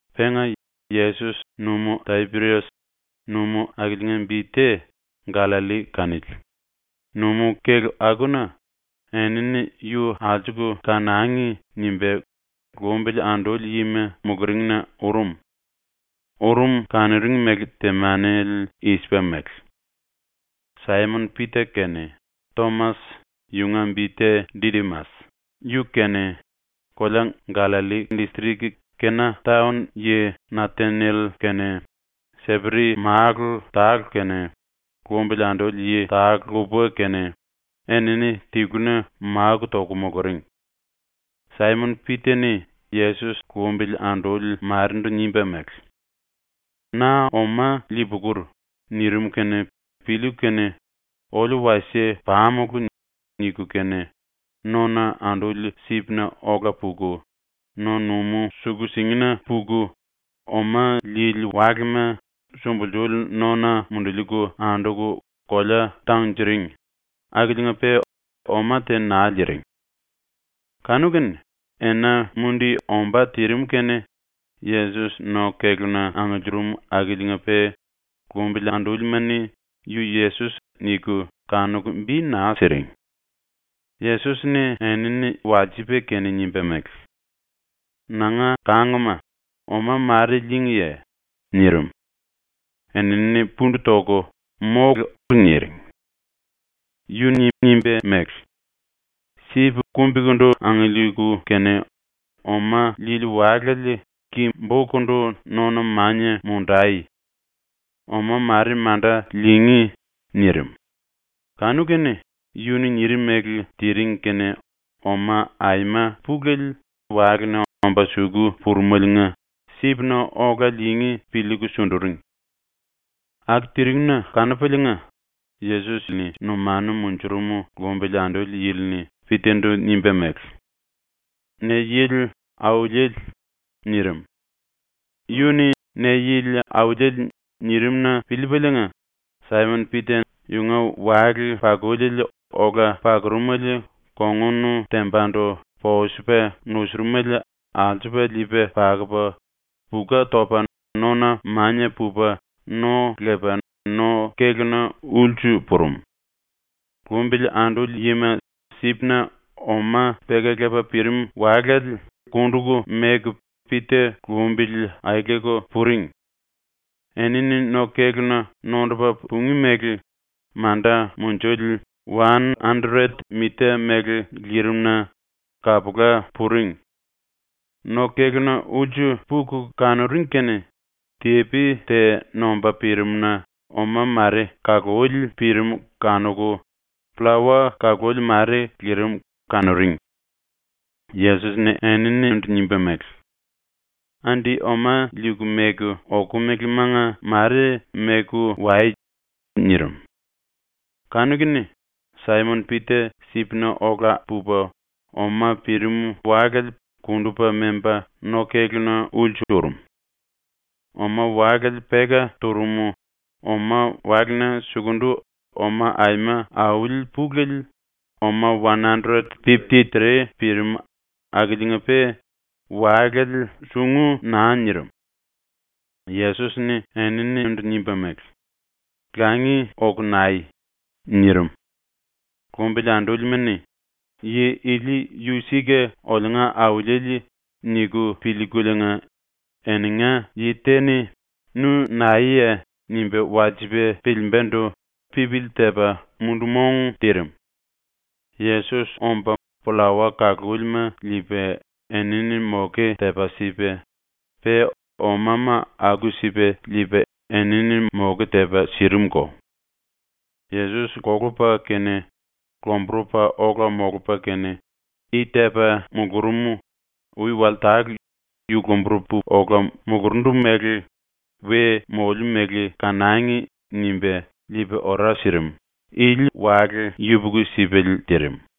Penga Yesos Numú-Tapirias ⸤numú akiliinga bi te Gallalli kanili,⸥ numú-kélu akuna ‘Enini yu alsuku kanangi.’ nimba lumbili anduli yima muluringna urum. Urum kanuring mele temanele i-sipa mele: Saimon-Pita kene, Tomas (yunga bi te Didimas) yu kene, kolea Gallalli distrik Kena taon yi Nataniel kene, Seperi málu tale kene, lumbili anduli yi tale lupa kene, enini tiluna máku toku muluring. Saimon-Pita-ni Yesos lumbili anduli marendu nimba mele: “Na oma lii-pukur.” nirim kene piliiku kene “Oliu wasie pamulu.” niku kene, nona anduli sipna ola puku, no-numú suku-singina puku oma liili walema sumbulsuli nona munduliiku anduku kolea tangunjiring akiliinga-pe oma te naa liiring. Kanu-kene ena mundi ombá tirim kene Yesos no-kéluna angiliirim akiliinga-pe lumbili andúlima-ni ‘Yu Yesos.’ niku kanuku bi naa siring. Yesos-ni enini walsipa kene nimba mele: “Nanga kangma, oma mare lííngiye?” nirim. Enini pundu toku “Mólu.” niring. Yu-ni nimba mele: “Sip kumbikundu angiliiku kene oma liili walale ki-bokundu nona mania mundai. Oma mare manda liingí.” nirim. Kanu-kene yu-ni nirim mele tiring kene oma aima pulele walena omba suku purumeliinga sipna ola liingí piliiku sunduring. Aku tirim-na kanupaliinga Yesos yunga numanu munjurum lumbili anduli yili-ni Pita-ndu nimba mele: “Ne yili Auliele.” nirim. Yu-ni “Ne yili Auliele.” nirim-na piliipaliinga Saimon-Pita yunga wale-pakuli ola pakurumele kongun tembandu posupa nusurumele alsupa liipa pakupa puka topa nona mania pupa no lepa no-kéluna ulsu purum. Lumbili anduli yima sipna oma peka lepa pirim walale kunduku meku Pita lumbili aeleku puring. Enini no-kéluna nondupa pungí mele manda munjuli wan andret mita mele lirim-na kapula puring. No-kéluna ulsu puku kanuring kene tepi te nomba pirimna oma mare kaluli pirim kanuku, pllawa-kaluli mare lirim kanuring. Yesos-ni eninindu nimba mele: “Andi oma liiku meku okomelemanga mare meku wai.” nirim. Kanu-kene Saimon-Pita sipna ola pupa oma pirim walale kundupa memba no-kéluna ulsu urum. Oma-walale peka turum, oma-walena sukundu oma aima auli ⸤pulele⸥, oma wan andret pipti tre, pirim akiliinga-pe walale sungu naa nirim. Yesos-ni eninindu nimba mele: “Langi oku nai.” nirim. Lumbili andúlima-ni ‘Yi ili yu sika oliunga Auliele.’ niku piliikuliinga eninga yi te-ni “Nu naeye?” nimba walsipa piliimbandu pipili tepa mundu-mong tirim. Yesos omba pllawa kalúlima liipa enini moke tepa sipa, pe omama aku-sipa liipa enini moke tepa sirimuko. Yesos kolupa kene lomburupa ola molupa kene, i tepa mulurum, ui wale tale ‘Yu lomburupu ola mulurundu mele we moliu mele kanangi.’ nimba liipa ora sirim, ili wale yupuku-sipale tirim.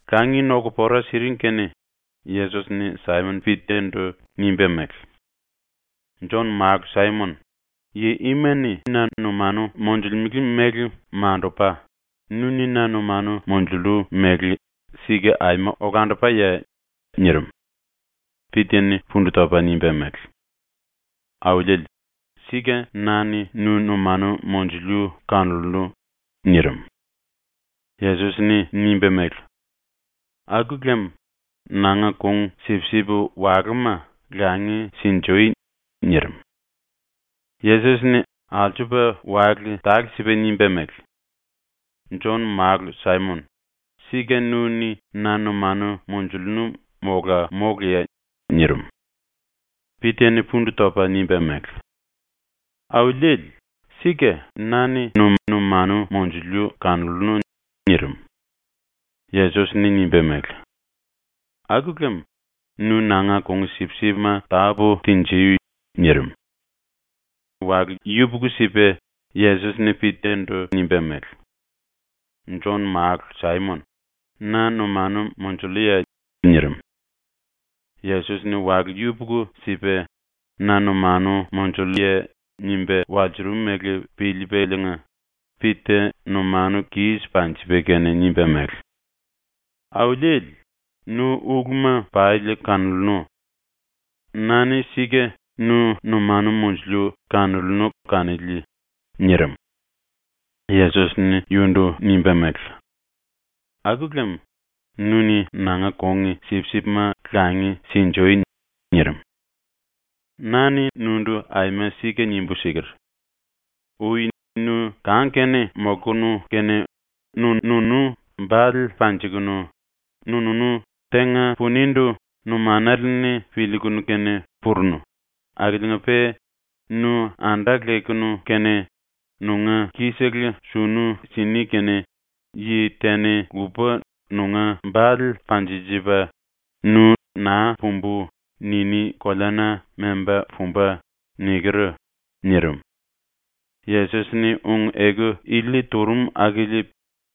Langi noku pora siring kene Yesos-ni Saimon-Pita-ndu nimba mele: “Jon-málu Saimon, yi ima-ni na numanu monjulemele mele mandupa, nu-ni na numanu monjullu mele sika aima olandupaye?” nirim. Pita-ni pundu topa nimba mele: “Auliele, sika na-ni nu numanu monjuliu kanollu.” nirim. Yesos-ni nimba mele: “Aku lem nanga kung-sipsip walúma langi sinjui.” nirim. Yesos-ni alsupa wale tale-sipa nimba mele: “Jon-málu Saimon, sika nu-ni na numanu monjullu mola móluye?” nirim. Pita-ni pundu topu nimba mele: “Auliele, sika na-ni nu numanu monjuliu kanollu.” nirim. Yesos-ni nimba mele: “Aku lem nu nanga kung-sipsipma tápu tinjui.” nirim. Ena yupuku-sipa Yesos-ni Pita-ndu nimba mele: “Jon-málu Saimon, na numanu monjulluye?” nirim. Yesos-ni wale yupuku-sipa “Na numanu monjulluye?” nimba walsurum mele piliipaliinga Pita numanu kis panjipa kene nimba mele: “Auliele, nu uluma pali kanollu. Na-ni sika nu numanu monjuliu kanollu kanili.” nirim. Yesos-ni yundu nimba mele: “Aku lem nu-ni nanga kung-sipsipma langi sinjui.” ⸤nirim.⸥ “Na-ni nundu aima sika nimbu siker: “Ui nu kang-kene molkunu kene nu-nunu bale panjikunu, nu-nunu tenga punindu numanale-ni piliikunu kene purunu, akiliinga-pe nu anda lekunu kene nunga ki-sele sunu sini kene yi te-ni lupa nunga bale panjinjipa, nu ‘naa pumbu.’ niní koleana memba pumba.” niker.” nirim. Yesos-ni ⸤ung-eku ili turum akili⸥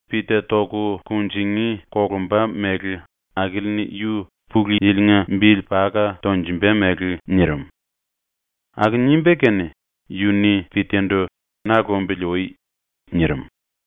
Pita toku kunjingí kolumba mele akili-ni yu Pulu Yili-nga bili paka tonjumba mele nirim. Aku nimba kene yu-ni Pita-ndu “Na lumbili ui.” nirim.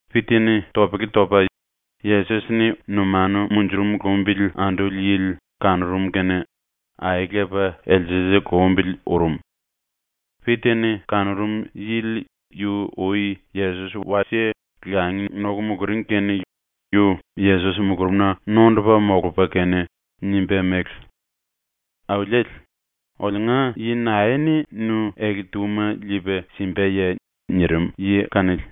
Pita-ni topele topa Yesos-ni numanu munjurum lumbili anduli yili kanurum kene aelepa elsele lumbili urum. (Pita-ni kanurum yili yu ui Yesos wasie langi noku muluring kene yu Yesos mulurumna nondupa molupa kene nimba mele: “Auliele, oliunga yi nae-ni nu ele-túma liipa simbaye?” nirim yi kanili.)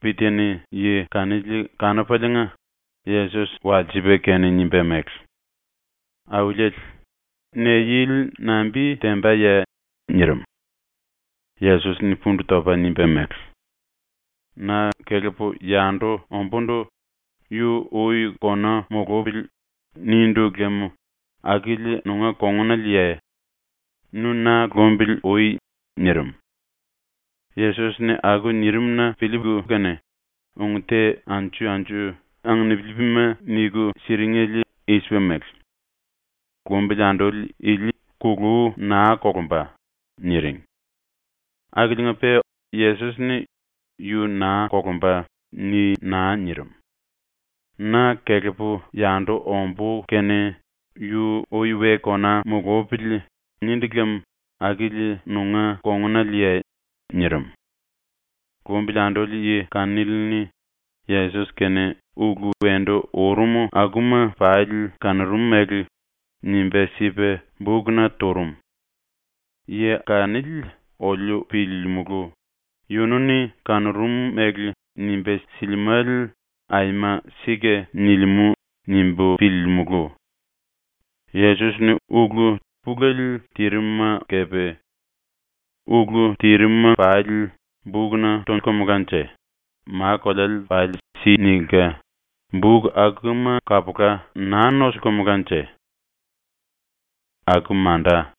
Pita-ni yi kanili kanupaliinga Yesos walsipa kene nimba mele: “Auliele, ne-yili nambi tembaye?” nirim. Yesos-ni pundu topa nimba mele: “‘Na kelepu yandu ombúndu yu ui kona mulupili.’ nindu lem akili nunga kongunaleye? Nu na lumbili ui.” nirim. Yesos-ni aku nirim-na piliiku kene ung te anju-anju anginipilima niku siringele i-sipa mele: “Lumbili anduli ili kulú naa kolumba.” niring. Akiliinga-pe Yesos-ni “Yu naa kolumba.” ni naa nirim. “‘Na kelepu yandu ombú kene yu ui we kona mulupili.’ nindu lem akili nunga kongunaleye?” nirim. Lumbili anduli yi kanili-ni ⸤Yesos-kene⸥ ulu wendu urum akuma pali kanurum mele nimba sipa bukna turum. Yi kanili oliu piliilimulu ‘Yunu-ni kanurum mele nimba silimále aima sika nilimú.’ nimbu piliilimulu. Yesos-ni ulu pulele tirim-ma kepe. Ulu tirim-ma pali bukna tolkumulanje ma-koleale pali si nilka, buk akuma kapula naa nosilkumulanje. ⸤Aku manda.⸥